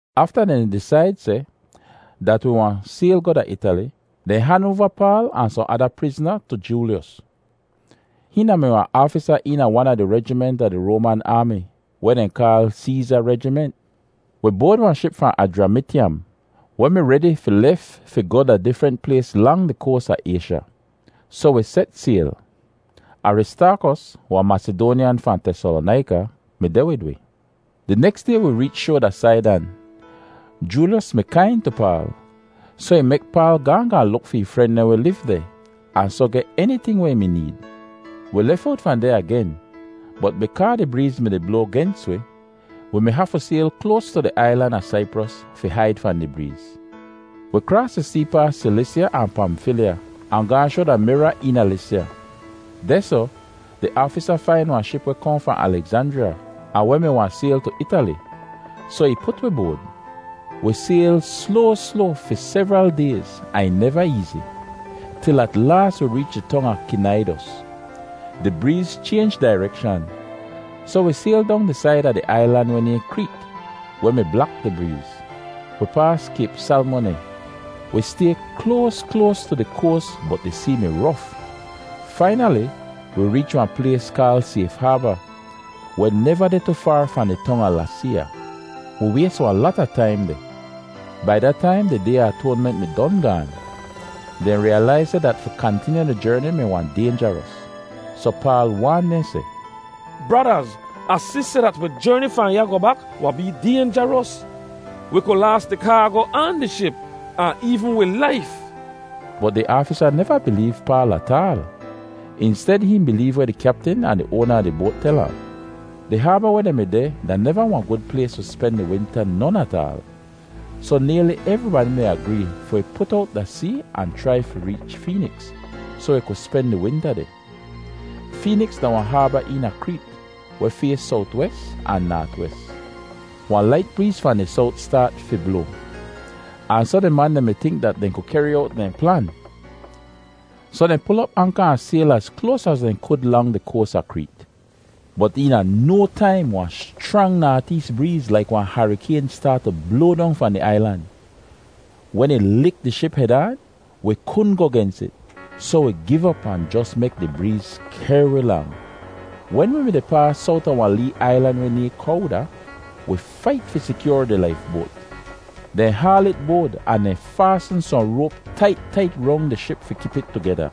Afta dehn disaid seh dat wi wahn sayl goh da Itali, dehn han oava Paal ahn sohn ada prizna tu Joolyos. Hihn da-mi wahn aafisa eena wan a di rejiment a di Roaman aami weh dehn kaal “Seeza Rejiment.” Wi boad wahn ship fahn Ajramityam weh mi redi fi lef fi goh da difrent plays lang di koas a Aysha; soh wi set sayl. Aristaakos, wahn Masidoanyan fahn Tesalonaika, mi deh wid wi. Di neks day wi reech shoa da Saidan. Joolyos mi kain tu Paal, soh ih mek Paal gaahn gaahn luk fi ih fren dehn weh liv deh ahn soh geh eniting weh ih mi need. Wi lef owt fahn deh agen bot bikaa di breez mi-di bloa gens wi, wi mi hafu sayl kloas tu di ailan a Saipros fi haid fahn di breez. Wi kraas di see paas Silisya ahn Pamfilya ahn gaahn shoa da Mira eena Lisya. Dehsoh di aafisa fain wahn ship weh kohn fahn Alegzanjriya ahn weh mi wahn sayl tu Itali; soh ih put wi boad. Wi sayl sloa sloa fi sevral dayz ahn ih neva eezi, til at laas wi reech di tong a Kinaidos. Di breez chaynj dairekshan, soh wi sayl dong di said a di ailan weh nayhn Kreet weh mi blak di breez. Wi paas Kayp Salmoneh. Wi stay kloas kloas tu di koas bot di see mi rof. Fainali wi reech wahn plays kaal Sayf Haaba, weh neva deh tu faar fahn di tong a Laseeya. Wi ways wahn lata taim deh. Bai da taim di Day a Atoanment mi don gaan. Dehn riyalaiz seh dat fi kantinyu di jerni mi wahn daynjaros, soh Paal waan dehn seh, “Bradaz, Ah si seh dat wi jerni fahn ya goh bak wahn bee daynjaros. Wi ku laas di kaago ahn di ship, ahn eevn wi laif.” Bot di aafisa neva bileev Paal ataal; insted hihn bileev weh di kyaptin ahn di oana a di boat tel ahn. Di haaba weh dehn mi deh da neva wahn gud plays fi spen di winta non ataal. Soh nayli evribadi mi agree fi wi put owt da see ahn chrai fi reech Feeniks soh wi ku spen di winta deh. Feeniks da wahn haaba eena Kreet weh fays sowt-wes ahn naat-wes. Wahn lait breez fahn di sowt staat fi bloa, ahn soh di man dehn mi tink dat dehn ku kehri owt dehn plan. Soh dehn pul op anka ahn sayl az kloas az dehn ku lang di koas a Kreet. Bot eena no taim wahn schrang naat-ees breez laik wahn harikayn staat tu bloa dong fahn di ailan. Wen ih lik di ship hed aan, wi kudn goh gens it, soh wi giv op ahn jos mek di breez kehr wi lang. Wen wi mi-di paas sowt a wahn lee ailan weh nayhn Kowda, wi fait fi sikyoar di laifboat. Dehn haal it boad ahn dehn faasn sohn roap tait tait rong di ship fi kip it tugeda.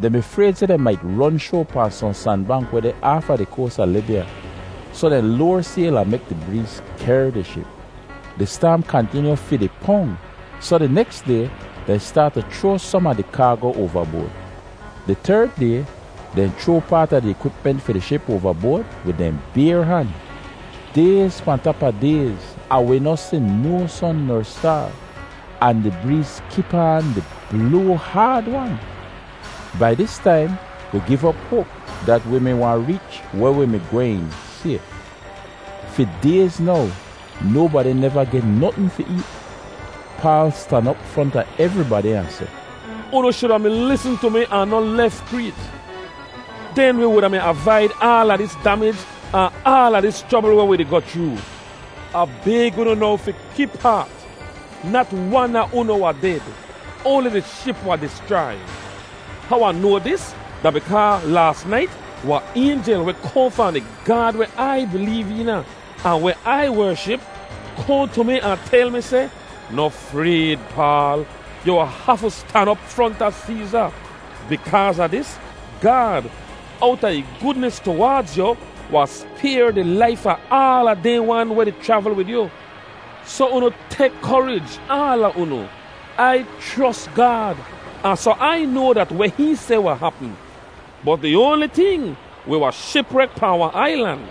Dehn mi frayd seh dehn mait ron shoa pahn sohn sanbank weh deh aafa di koas a Libya, soh dehn loar sayl ahn mek di breez kehr di ship. Di staam kantinyu fi di pong, soh di neks day dehn staat tu chroa som a di kaago oavaboad. Di terd day dehn chroa paat a di ikwipment fi di ship oavaboad wid dehn bayr han. Dayz pahn tap a dayz ahn wi noh si no son ner staar, ahn di breez kip aan di bloa haad-wan. Bai dis taim wi giv op hoap dat wi mi wahn reech weh wi mi gwehn sayf. Fi dayz now nobadi neva geh notn fi eet. Paal stan op fronta evribadi ahn seh, “Unu shuda mi lisn tu mi ahn noh lef Kreet; den wi wuda mi avaid aala dis damij ahn aala dis chrobl weh wi di goh chroo. Ah bayg unu now fi kip haat! Nat wan a unu wahn ded; oanli di ship wahn dischrai. How Ah noa dis da bikaa laas nait wahn aynjel weh kohn fahn di Gaad weh Ai bileev eena ahn weh Ai wership, kohn tu mi ahn tel mi seh, ‘Noh frayd, Paal! Yu hafu stan op fronta Seeza. Bikaaz a dis, Gaad, owta ih gudnis tuwaadz yu, wahn spayr di laif a aala dehn wan weh di chravl wid yu.’ Soh unu tek korij, aala unu! Ai chros Gaad ahn soh Ai noa dat weh hihn seh wahn hapm. Bot di oanli ting, wi wahn shiprek pahn wahn ailan.”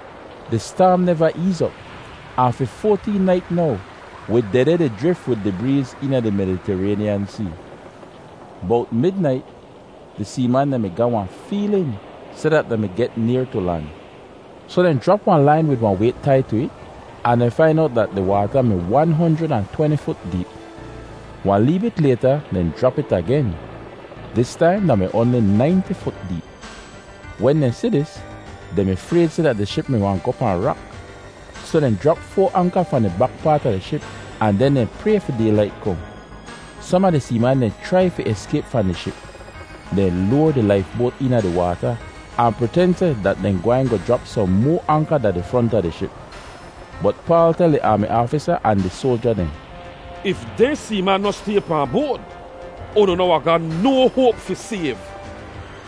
Di staam neva eez op ahn fi foateen nait now wi dehdeh di jrif wid di breez eena di Meditaraynyan See. Bowt midnait di seeman dehn mi ga wahn feelin seh dat dehn mi get nayr tu lan. Soh dehn jrap wahn lain wid wahn wayt tai aan tu it ahn dehn fain owt seh dat di waata mi wan honjrid ahn tweni fut deep. Wahn lee bit layta dehn jrap it agen. Dis taim da mi oanli nainti fut deep. Wen dehn si dis, dehn mi frayd seh dat di ship mi wahn goh pahn rak, soh dehn jrap foa anka fahn di bak paat a di ship ahn den dehn pray fi daylait kohn. Som a di seeman dehn chrai fi eskayp fahn di ship. Dehn loar di laifboat eena di waata ahn priten seh dat dehn gwehn goh jrap sohn moa anka da di front a di ship. Bot Paal tel di aami aafisa ahn di soalja dehn, “If dehn seeman noh stay pahn boad, unu noh wahn ga no hoap fi sayv.”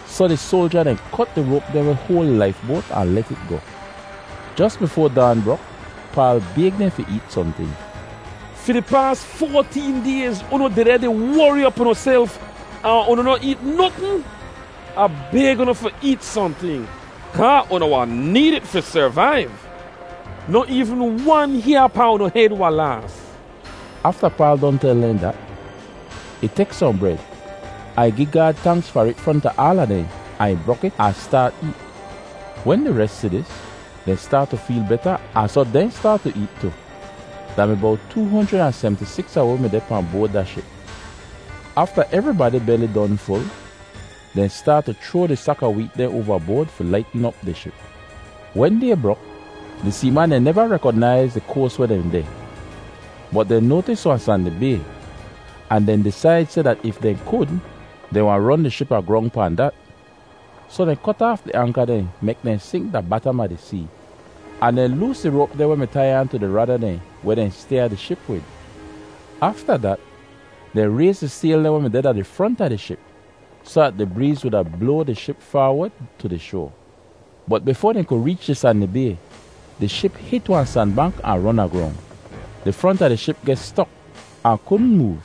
Soh di soalja dehn kot di roap dehn weh hoal di laifboat ahn let it goh. Jos bifoa daan brok Paal bayg dehn fi eet sohnting. “Fi di paas foateen dayz unu dehdeh di wori op unuself ahn unu noh eet notn. Ah bayg unu fi eet sohnting kaa unu wahn need it fi servaiv. Noh eevn wan hyaa pahn unu hed wahn laas.” Afta Paal don tel dehn dat, ih tek sohn bred, ahn ih gi Gaad tanks far it fronta aala dehn, ahn ih brok it ahn staat eet. Wen di res si dis, dehn staat tu feel beta ahn soh dehn staat tu eet tu. Da mi bowt too honjrid ahn semti-siks a wi mi deh pahn boad da ship. Afta evribadi beli don ful, dehn staat tu chroa di sak a weet dehn oavaboad fi laitn op di ship. Wen day brok, di seeman dehn neva rekonaiz di koas weh dehn deh, bot dehn noatis wahn sandi bay ahn dehn disaid seh dat if dehn kud, dehn wahn ron di ship agrong pahn dat. Soh dehn kot aaf di anka dehn mek dehn sink da batam a di see ahn dehn loos di roap dehn weh mi tai aan tu di roda dehn weh dehn styaa di ship wid. Afta dat dehn rayz di sayl dehn weh deh da di front a di ship soh dat di breez wuda bloa di ship faawod tu di shoa. Bot bifoa dehn ku reech di sandi bay, di ship hit wahn sanbank ahn ron agrong. Di front a di ship geh stok ahn kudn moov,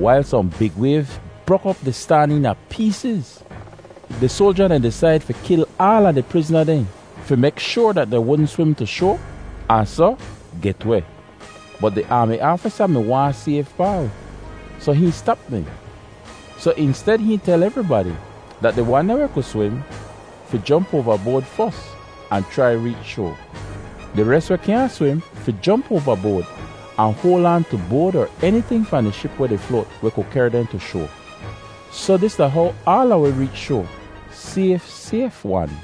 wailz sohn big wayv brok op di staan eena peesiz. Di soalja dehn disaid fi kil aala di prizna dehn fi mek shoar dat dehn wudn swim tu shoa ahn soh get weh. Bot di aami aafisa mi waahn sayv Paal, soh hihn stap dehn. Soh insted hihn tel evribadi dat di wan dehn weh ku swim fi jomp oavaboad fos ahn chrai reech shoa. Di res weh kyaahn swim fi jomp oavaboad ahn hoal aan tu boad er eniting fahn di ship weh di float weh ku kehr dehn tu shoa. Soh dis da how aala wi reech shoa sayf sayf-wan.